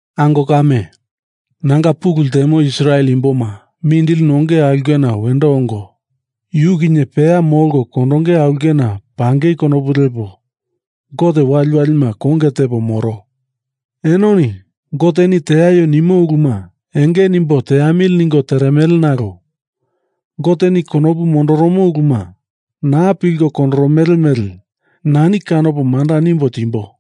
Ango kame, nanga pulu ltemo Israel imboma mindili nonge aulkena wendo ongo, yu kinye peya molko kondonge aulkena pangei konopu lepo Gote waliwalima konge tepo moro. Enoni Goteni teaio nimo uluma enge nimbo teamili ningo teremele nalo Goteni konopu mondoromo uluma naa pilko kondoromele mele nani kanopo manda nimbo timbo.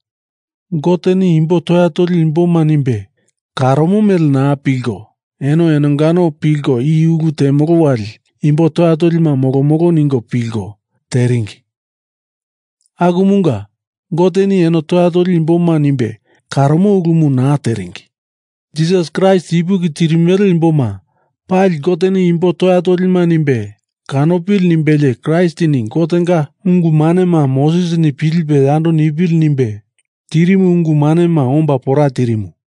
Goteni imbo toya toli imboma nimbe karomo mele naa pilko, eno enongano pilko i ulu temolo wali imbo toya tolima molomolo ningo pilko teringi. Akumunga Goteni eno toya toli imboma nimbe karomo ulumu naa teringi. Jisas Kraist ipuki tirimele imboma pali Goteni imbo toya tolima nimbe kanopili nimbelie Kraistini Gotenga ungu manema Mosesini pilipe yando nimbe tirimu ungu manema omba pora tirimu.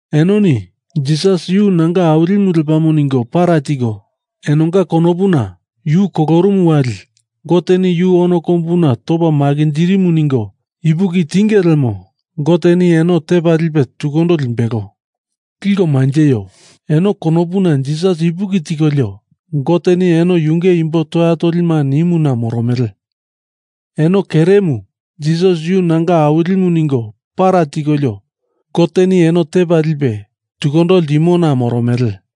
Enoni Jisas yu nanga Awilimu lepamo ningo para tiko, enonga konopuna Yu kolorumu wali Goteni yu ono kombuna topa makinjirimu ningo ipuki tinge lemo Goteni eno tepa lipe tukundo limbelo. Liko manjeio. Eno konopuna Jisas ipuki tikolio Goteni eno yunge imbo toya tolima nimuna moromele. Eno keremu Jisas yu nanga Awilimu ningo para tikolio Goteni eno tepa lipe tukundo ltimona moromele.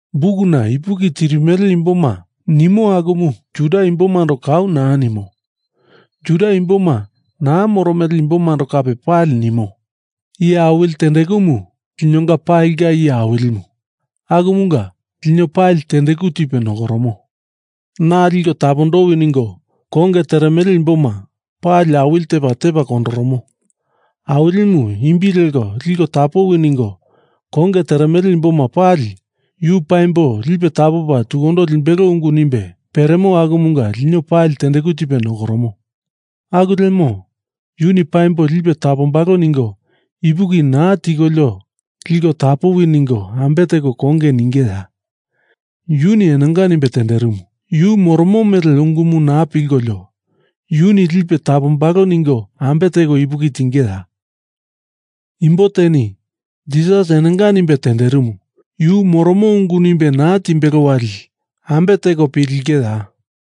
Bukuna ipuki tirimele imboma nimo akumu Juda imbomando kau naa nimo. Juda imboma naa moromele imbomando kape pali nimo. Iye awili tendekumu linonga palinga Iye Awilimu akumunga lino pali tendeku tipe nokoromo. Na liko tapondowi ningo konge teremele imboma pali awili tepa, tepa kondoromo. Awilimu imbi leko liko tapowi ningo konge teremele imboma pali Yu paimbo lipe tapopa tukundo limbelo ungu nimbe peremo akumunga lino pali tendeku tipe nokoromo. Aku lemo Yuni paimbo lipe tapombalo ningo ipuki naa tikolio liko tapowi ningo ambe teko yu konge ningeya? Yuni enonga nimbe tenderimu, yu moromo mele ungumu naa pilkolio Yuni lipe tapombalo ningo ambe teko ipuki tingeya? Imbo teni Jisas enonga nimbe tenderimu, yu moromo ungu nimbe naa timbelo wali eno ambe teko pilingeya?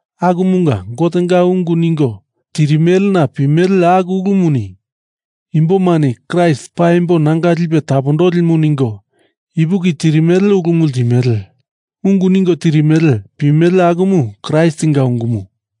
Akumunga Gotenga ungu ningo tirimelena pimele aku ulumuni imbomani Kraist paimbo nanga lipe tapondolimu ningo ipuki tirimele ulumu ltimele. Ungu ningo tirimele pimele akumu Kraistinga ungumu.